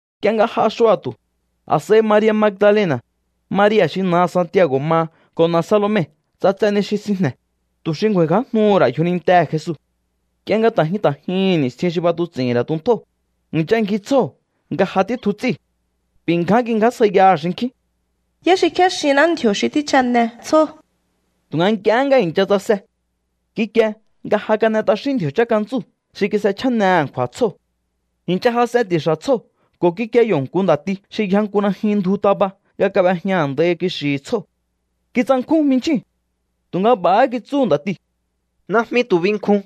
Nk'ie nga j'a xua̱tu̱, a̱s'a̱i Maria̱ Magdalena̱, Maria̱ xi na̱aha̱ Santiago̱ maha ko̱ na̱ Salome ts'atse ni xi sinjne̱, tu̱ xi ngju̱a̱i̱ngjájnuhu̱ ra̱ yjonintehe̱ Jesu. Nk'ie nga ta̱ jyun ta̱ jyuhu̱n ni̱stjin xi b'atuts'i̱hi̱n ra̱ tuntjóo̱, i̱ncha ngji tsjóo̱ nga ja títju ts'íu̱. B'i̱ ngján kingjásjaiyaha̱ xinkjín: —¿Yá xi kjéxinná ndji̱o̱ xi tjíchjane tsjóo̱? Tu̱nga nk'iehé nga i̱ncha tsase, kikie nga ja kan'e t'axín ndji̱o̱ chánkantsú xi kis'echjáne a̱nkju̱a̱ha̱ tsjóo̱. I̱ncha jas'en ti̱xa̱ tsjóo̱ ko̱ kikie yo̱ nku nda̱ti xi yja nku najyun ndju taba nga kab'ejña a̱ndai kixi̱hi̱ tsjóo̱. Kitsankjún jminchjíu̱n. Tu̱nga b'a̱há kitsú nda̱tiu̱: —Najmi tu̱ binkjun.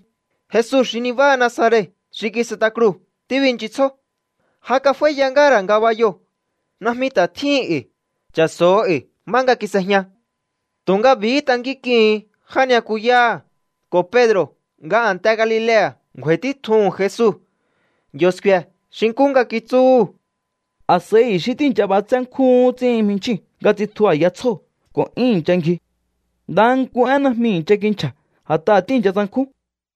Jesu xi nibáha Nazaret xi kis'et'a kruu̱ tíbinchisjó. Ja kaf'áíya ngáha̱ ra̱ ngabayoo̱. Najmi ta̱ tjíhin e̱i̱. Cha̱so̱o e̱i̱ má nga kis'ejña. Tu̱nga b'i̱hí tankínk'ihu̱un já ni'yakuyáha̱ ko̱ Pedro̱ nga a̱nte Galilea̱ ngju̱a̱i̱ títjuhu̱n Jesu. Yo̱ sku̱e̱ xi nkú nga kitsúhu̱. A̱s'a̱i i̱xí tíi̱ncha b'atsé nkjúhún ts'íhin jminchjíu̱n nga tsitju a̱ya tsjóo̱ ko̱ 'yún i̱ncha ngji. Ndaha nku én najmi i̱ncha kinchja̱ a̱t'aha̱ tíi̱ncha tsankjún.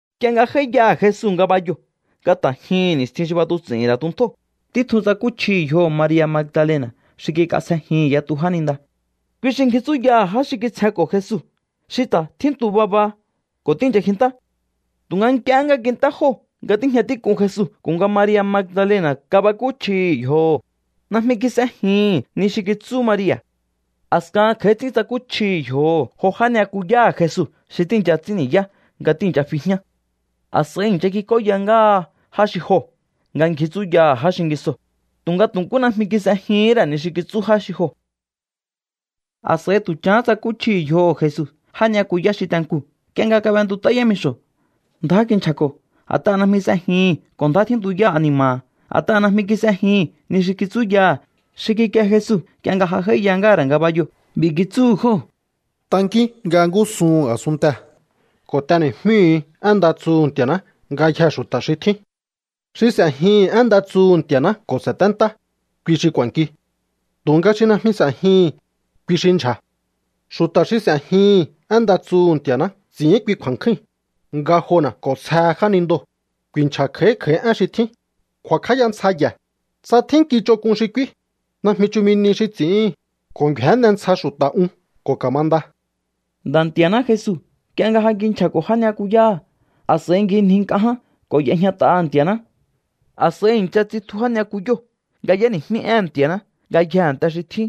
Nk'ie nga j'áíyaha̱ Jesu ngabayoo̱ nga ta̱ jyuhu̱n ni̱stjin xi tíb'atuts'i̱hi̱n ra̱ tuntjóo̱, títjun tsakúchjihi̱ yjoho̱ Maria̱ Magdalena̱ xi kik'asjejihi̱n yatu jáninda. Kui xi ngji tsúyaha̱ já xi kitsjenko̱ Jesu xi ta̱ tjíntu baba ko̱ tíi̱ncha kjintá. Tu̱nga nk'iehé nga kint'é jóo̱ nga tíjña tík'un Jesu ko̱ nga Maria̱ Magdalena̱ kabakúchjihi̱ yjoho̱, najmi kis'ejihi̱n ni xi kitsú Maria̱. A̱skahan kj'a̱í ts'ín tsakúchjihi̱ yjoho̱ jo já ni'yakuyáha̱ Jesu xi tíi̱ncha ts'ín ni̱yá nga tíi̱ncha fi jñá. A̱s'a̱i i̱ncha kik'óya ngáha já xi joo̱ nga ngji tsúyaha̱ já xingisoo̱, tu̱nga tu̱ nkú najmi kis'ejihín ra̱ ni xi kitsú já xi joo̱. A̱s'a̱i tu̱ chahán tsakúchjihi̱ yjoho̱ Jesu já ni'yakuyá xi te nkuu̱ nk'ie nga kab'entut'á yámixo̱. Ndjá kinchja̱ko̱ a̱t'aha̱ najmi s'ejihi̱n ko̱ ndjá tjíntuyá ani̱ma̱ha̱, a̱t'aha̱ najmi kis'ejihi̱n ni xi kitsúyaha̱ xi kikie Jesu nk'ie nga ja j'áíya ngáha̱ ra̱ ngabayoo̱. B'i̱ kitsúhu̱ jóo̱: —Tankíún nga ngúsuhu̱n a̱sunntee̱ ko̱ t'eni̱jmíhu̱u én nda tsuhu̱ Nti̱a̱ná ngayjee̱ xu̱ta̱ xi tjín. Xi s'e̱jihi̱n én nda tsuhu̱ Nti̱a̱ná ko̱ sa̱téntá, kui xi k'u̱a̱nki. Tu̱nga xi najmi s'e̱jihi̱n, kui xi ndyja̱. Xu̱ta̱ xi s'e̱jihi̱n én nda tsuhu̱ Nti̱a̱ná ts'i̱ín kui kju̱a̱nkjúi̱n: ngajona̱ k'o̱nsjehe jánindoo̱, ku̱i̱nchja̱ kj'a̱í kj'a̱í én xi tjín, ku̱a̱kj'áya ntsja ye̱, tsa tjín nki ch'onk'un xi k'úí, najmi chumi nihi xi ts'i̱íhi̱n, ko̱ ngju̱énne ntsja xu̱ta̱ un ko̱ ka̱manda. Nda̱ Nti̱a̱ná Jesu, nk'ie nga ja kinchja̱ko̱ já ni'yakuyáha̱, a̱s'a̱i ngjinji nk'a ján ko̱ y'ejñat'aha̱ Nti̱a̱ná. A̱s'a̱i i̱ncha tsitju já ni'yakuyóo̱ nga y'éni̱jmí éhe̱n Nti̱a̱ná ngayjee̱ a̱nte xi tjín.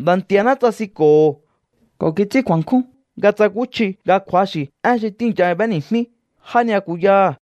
Nda̱ Nti̱a̱ná tsasinko̱ho̱ ko̱ kits'ín kju̱a̱nkjún nga tsakúchji nga kju̱axi̱ én xi tíi̱ncha b'éni̱jmí já ni'yakuyáha̱.